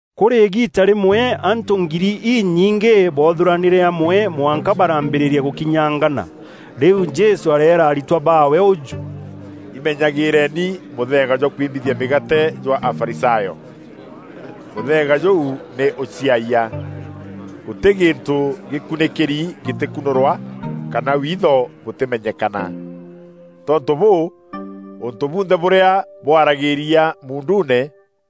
Kûrî îgiita rîmwe antû ngiri inyingî boothûranîre amwe mwanka baraambîrîria gûkinyangana. Rîu Jesû areera aritwa baawe ûjû, “Imenyagîîreni mûtheega jwa kwimbithia mîgaate jwa Afarisayo. Mûtheega jûu nî ûciayia. Gûtî gîntû gîkunîkîri gîtîkûnûrwa, kana witho bûtîmenyekana. Tontû bûû, ûntû bunthe bûrîa bwaragîria muunduune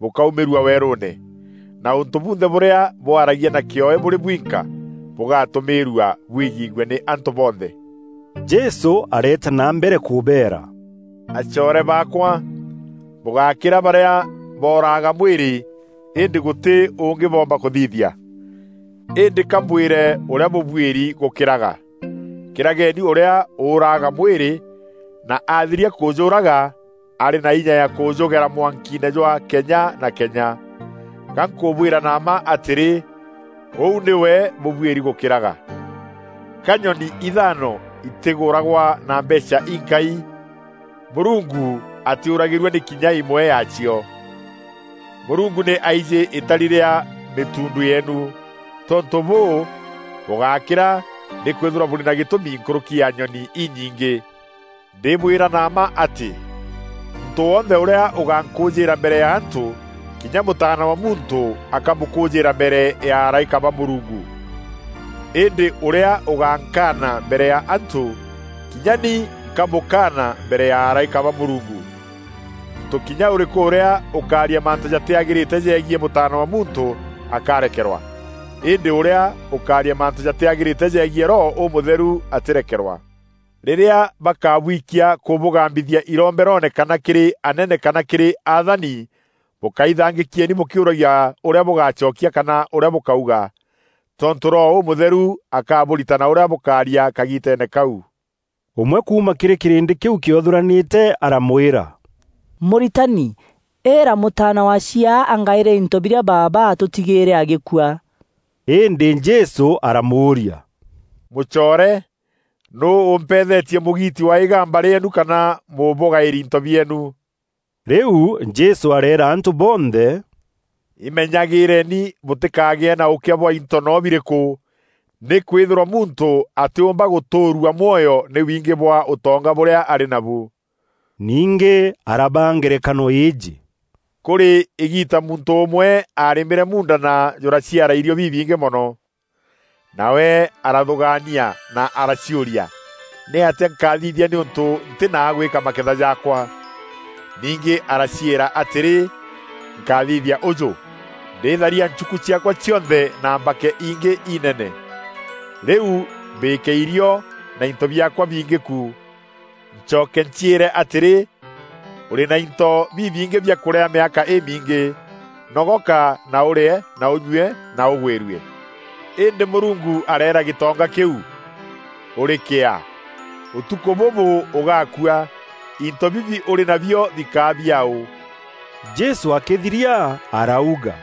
bûkaumîrua weerûûne, na ûntû bunthe bûrîa bwaragia na kîoe bûrî bwinka, bûgatûmîîrua bwigîîgue nî antû bonthe.” Jesû areeta na mbere kûbeera, “Acoore baakwa, bûgákîra barîa boraaga mwîrî, îndî gûtî ûngî boomba kûthithia. Îndî ka mbwîre ûrîa bûbuîri gûkîraga: kîrageni ûrîa ûûraga mwîrî, na aathiria kûjûûraga, arî na inya ya kûjûgera mwankiine jwa kenya na kenya. Ga nkûbwîra na mma atîrî, ûu nîwe bûbuîri gûkîraga. Ka nyoni ithaano itîgûragwa na mbeecha inkai? Mûrungu atîûragîrua nî kinya îmwe yaacio. Mûrungu nî aijî îtari rîa mîtuundu yeenu. Tontû bûû, bûgákîra nîkwîthîrwa bûrî ba gîtûmi nkûrûki ya nyoni inyingî.” “Ndîbwîra na mma atî, muntû wonthe ûrîa ûgankûûjîîra mbere ya antû, kinya Mûtaana wa Muntû akamûkûûjîîra mbere ya araîka ba Mûrungu. Îndî ûrîa ûgankaana mbere ya antû, kinya ni nkamûkaana mbere ya araîka ba Mûrungu. Muntû kinya ûrîkû ûrîa ûkaaria mantû jatîagîrîte jegiî Mûtaana wa Muntû akarekerwa; îndî ûrîa ûkaaria mantû jatîagîrîte jegiî Roho Ûmûtheru atîrekerwa. Rîrîa bakabwikia kûbûgambithia iromberoone kana kîrî anene kana kîrî athani, bûkaithangîkieni bûkîuragia ûrîa bûgacokia kana ûrîa bûkauga. Tontû Roho Ûmûtheru akabûritana ûrîa bûkaaria kagiiteene kau.” Ûmwe kuuma kîrî kîrîndî kîu kîothûranîte aramwîra, “Mûritani, îîra mûtaana wa chiaa angaîre into birîa baaba atûtigîîre agîkua.” Îndî Jesû aramûûria, “Mûcoore! Nûû ûmpethetie mûgiiti wa îgamba rîeenu kana mûbûgaîri into bieenu?” Rîu Jesû aareera antû bonthe, “Imenyagîîreni bûtîkagîe na ûkîa bwa into no birîkû; nîkwîthîrwa muntû atîûmba gûtûûrua mwoyo nî wingî bwa ûtonga bûrîa arî nabu.” Ningî arabaa ngerekano îîjî, “Kûrî îgiita muntû ûmwe arîmîre muunda na jûraciara irîo bibingî mono. Nawe arathûgaania na araciûria, ‘Nîatîa nkathithia nîûntû ntî na a gwîka maketha jaakwa?’ Ningî araciîra atîrî, ‘Nkaathithia ûjû: ndîtharia nchuku ciaakwa cionthe na mbake ingî inene. Rîu mbîke irîo na into biaakwa bingî ku. Ncoke nciîre atîrî, Ûrî na into bibingî biakûrîa mîaka îmiingî. Nogoka, na ûrîe na ûnyûe na ûgwîrue.’ Îndî Mûrungu areera gîtonga kîu, ‘Ûrî kîaa, ûtukû bûbû ûgaakua! Into bibi ûrî nabio bikaa biaaû?’” Jesû akîthiria arauga,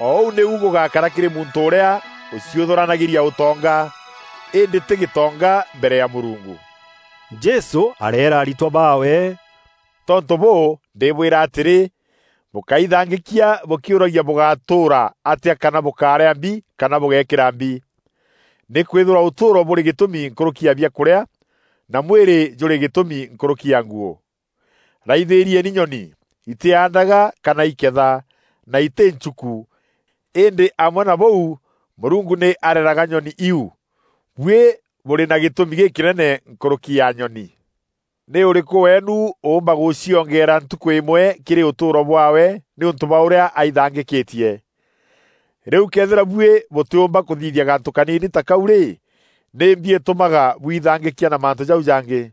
“O ûu nîu gûgakara kîrî muntû ûrîa ûciûthûranagîria ûtonga, îndî tî gîtonga mbere ya Mûrungu.” Jesû areera aritwa baawe, “Tontû bûû, ndîbwîra atîrî, bûkáithangîkia bûkîûragia bûgatûûra atîa kana bûkarîa mbi kana bûgeekîra mbi. Nîkwîthîrwa ûtûûro bûrî gîtûmi nkûrûki ya biakûrîa, na mwîrî jûrî gîtûmi nkûrûki ya nguû. Raithîrieni nyoni: itîaandaga kana îketha, na îtî nchuku, îndî amwe na bûu, Mûrungu nî areraga nyoni iu. Buî bûrî ba gîtûmi gîkînene nkûrûki ya nyoni! Nî ûrîkû weenu ûûmba gûciongeera ntukû îmwe kîrî ûtûûro bwaawe nîûntû bwa ûrîa aithangîkîtie? Rîu këethîra buî bûtîûmba kûthithia gantû kaniini ta kau rî, nîmbi îtûmaga bwithangîkia na mantû jau jangî?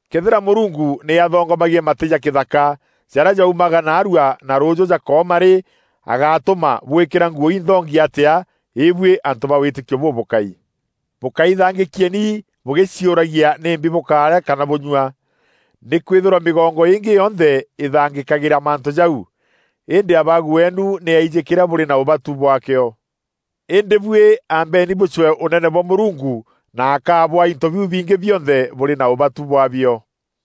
Këethîra Mûrungu nî athongomagia matî ja kîthaka, jarîa jaumaga naarua na rûûjû jakooma rî, agatûma bwîkîra nguû inthongi atîa, îbuî antû ba wîtîkio bûbûkai! Bûkaithangîkieni bûgîciûragia nîmbi bûkaarîa kana bûnyua. Nîkwîthîrwa mîgongo îngî yonthe ithangîkagîria mantû jau; îndî Abaagu weenu nî aijî kîrîa bûrî na ûbatu bwaakîo. Îndî buî ambeeni bûcwee Ûnene bwa Mûrungu na akabûaa into biu bingî bionthe bûrî na ûbatu bwaabio.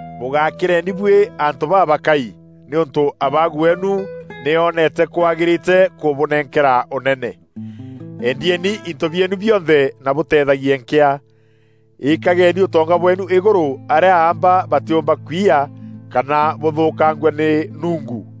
“Bûgakîreni buî antû babakai, nîûntû Abaagu weenu nî oonete kwagîrîte kûbûnenkera Ûnene. Endieni into bieenu bionthe na bûteethagie nkîa. Îkageni ûtonga bweenu Îgûrû arîa aamba batîûmba kwiya kana bûthûkangua nî nungu.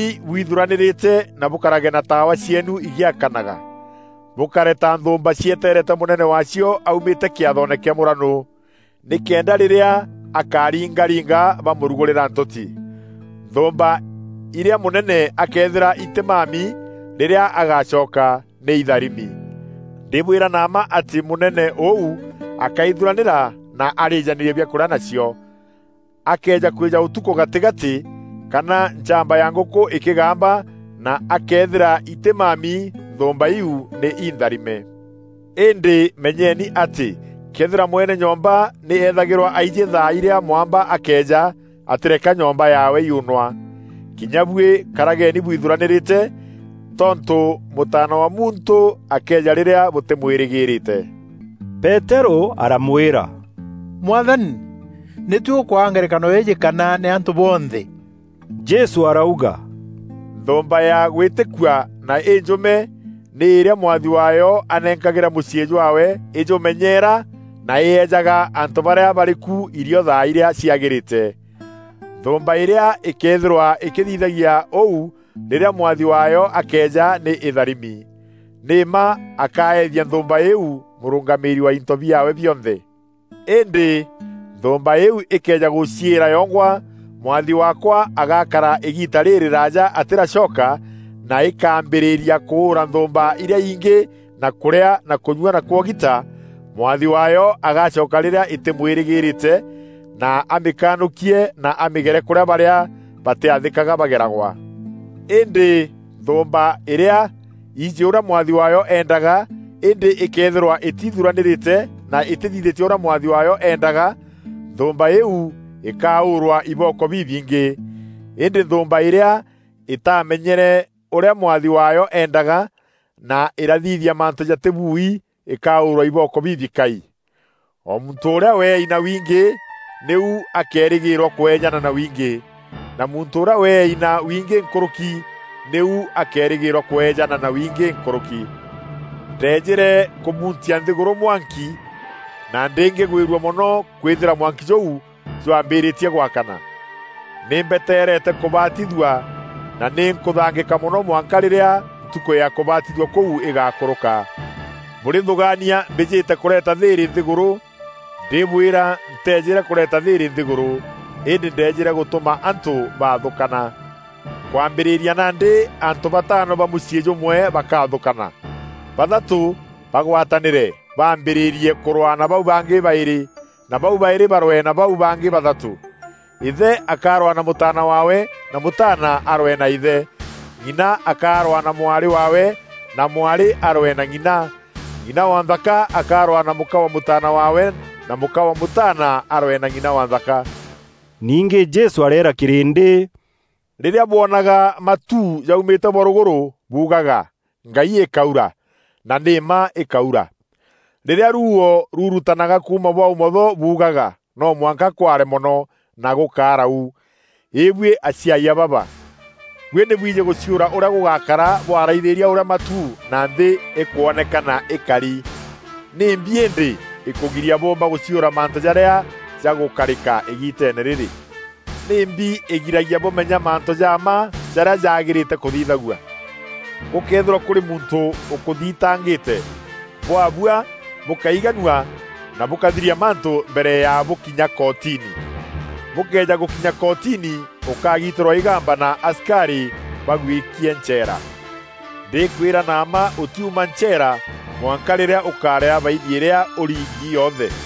“Karageni bwithuranîrîte na bûkarage na taawa cieenu îgîakanaga, bûkare ta nthûûmba cietereete mûnene waacio aumîte kîathoone kîa mûranû. Nîkenda rîrîa akaringaringa bamûrugûrîra ntûti. Nthûûmba irîa mûnene akeethîra itîmami rîrîa agacoka, nî itharimi. Ndîbwîra na mma atî mûnene ûu akaithuranîra na arîjanîrie biakûrîa nacio. Akëeja kwîja ûtukû gatîgatî, kana nchamba ya ngûkû îkîgamba na akethîra itîmami, nthûûmba iu nî intharime. Îndî menyeni atî, këethîra mwene nyomba nî ethagîrwa aijî thaa irîa mwamba akeeja, atîreka nyomba yaawe yuunwa. Kinya buî karageni bwithuranîrîte, tontû Mûtaana wa Muntû akeeja rîrîa bûtîmwîrîgîrîte.” Peterû aramwîra, “Mwathani, nî tuî ûkwaa ngerekano îîjî kana nî antû bonthe?” Jesû arauga, “Nthûûmba ya gwîtîkua na înjûme nî îrîa mwathi waayo anenkagîra mûciî jwaawe îjûmenyeera na îejaga antû barîa barî ku irio thaa irîa ciagîrîte. Nthûûmba îrîa îkeethîrwa îkîthithagia ûu rîrîa mwathi waayo akeeja nî îtharimi. Nî mma akaethia nthûûmba îîu mûrûngamîîri wa into biaawe bionthe. Îndî nthûûmba îîu îkëeja gûciîra yongwa, ‘Mwathi waakwa agakara îgiita rîrîraaja atîracoka,’ na îkaambîrîria kûûra nthûûmba irîa ingî na kûrîa na kûnyua na kwogita, mwathi waayo agacoka rîrîa îtîmwîrîgîrîte na amîkanûkie na amîgere kûrîa barîa batîathîkaga bageragwa. Îndî nthûûmba îrîa ijî ûrîa mwathi waayo eendaga îndî îkeethîrwa îtithuranîrîte na îtîthithîtie ûrîa mwathi waayo endaga, nthûûmba îîu îkaûûrwa ibooko bibingî. Îndî nthûûmba îrîa îtaamenyere ûrîa mwathi waayo eendaga, na îrathithia mantû jatîbui îkaûûrwa ibooko bibikai. O muntû ûrîa weei na wingî, nîu akeerîgîrwa kwejana na wingî; na muntû ûrîa weei na wingî nkûrûki, nîu akeerîgîrwa kweejana na wingî nkûrûki. “Ndeejîre kûmuntia nthîgûrû mwanki na ndîngîgwîrua mono kwîthîra mwanki jûu jwambîrîtie gwakana! Nî mbeteereete kûbatithua na nî nkûthangîka mono mwanka rîrîa ntukû ya kûbatithua kûu îgakûrûka. Bûrîthûgaania mbîjîte kûreeta thîîrî nthîgûrû? Ndîbwîra, nteejîre kûreeta thîîrî nthîgûrû, îndî ndeejîre gûtûma antû baathûkana. Kwambîrîria nandî antû bataano ba mûciî jûmwe bakaathûkana; bathatû bagwatanîre bambîrîrie kûrwaa na bau bangî baîrî na bau baîrî barwee na bau bangî bathatû. Îthe akarwaa na mûtaana waawe na mûtaana arwee na îthe; ng'ina akarwaa na mwarî waawe na mwarî arwee na ng'ina; ng'ina wa nthaka akarwaa na mûka wa mûtaana waawe na mûka wa mûtaana arwee na ng'ina wa nthaka.” Ningî Jesû areera kîrîndî, “Rîrîa bwonaga matu jaumîte bwa rûgûrû buugaga, ‘Ngai îkaura,’ na nî mma îkaura. Rîrîa ruuo rurutanaga kuuma bwa ûmotho buugaga, ‘No mwanka kware mono,’ na gûgakara u. Îbuî aciayia baba! Buî nî bwîjî gûciûra ûrîa gûgakara bwaraithîîria ûrîa matu na nthî îkwonekana îkari. Nîmbi îndî îkûgiria bûûmba gûciûra mantû jarîa jagûkarîka îgiiteene rîrî?” “Nîmbi îgiragia bûmenya mantû ja mma, jarîa jaagîrîte kûthithagua? Gûkëethîrwa kûrî muntû ûkûthitangîte, bwabua bûkaiganua na bûkathiria mantû mbere ya bûkinya kootini. Bûkëeja gûkinya kootini ûkagiitîrwa îgamba na asikarî bagwîkie ncheera. Ndîkwîra na mma ûtiuma ncheera mwanka rîrîa ûkarîa baini îrîa ûrîngî yonthe.”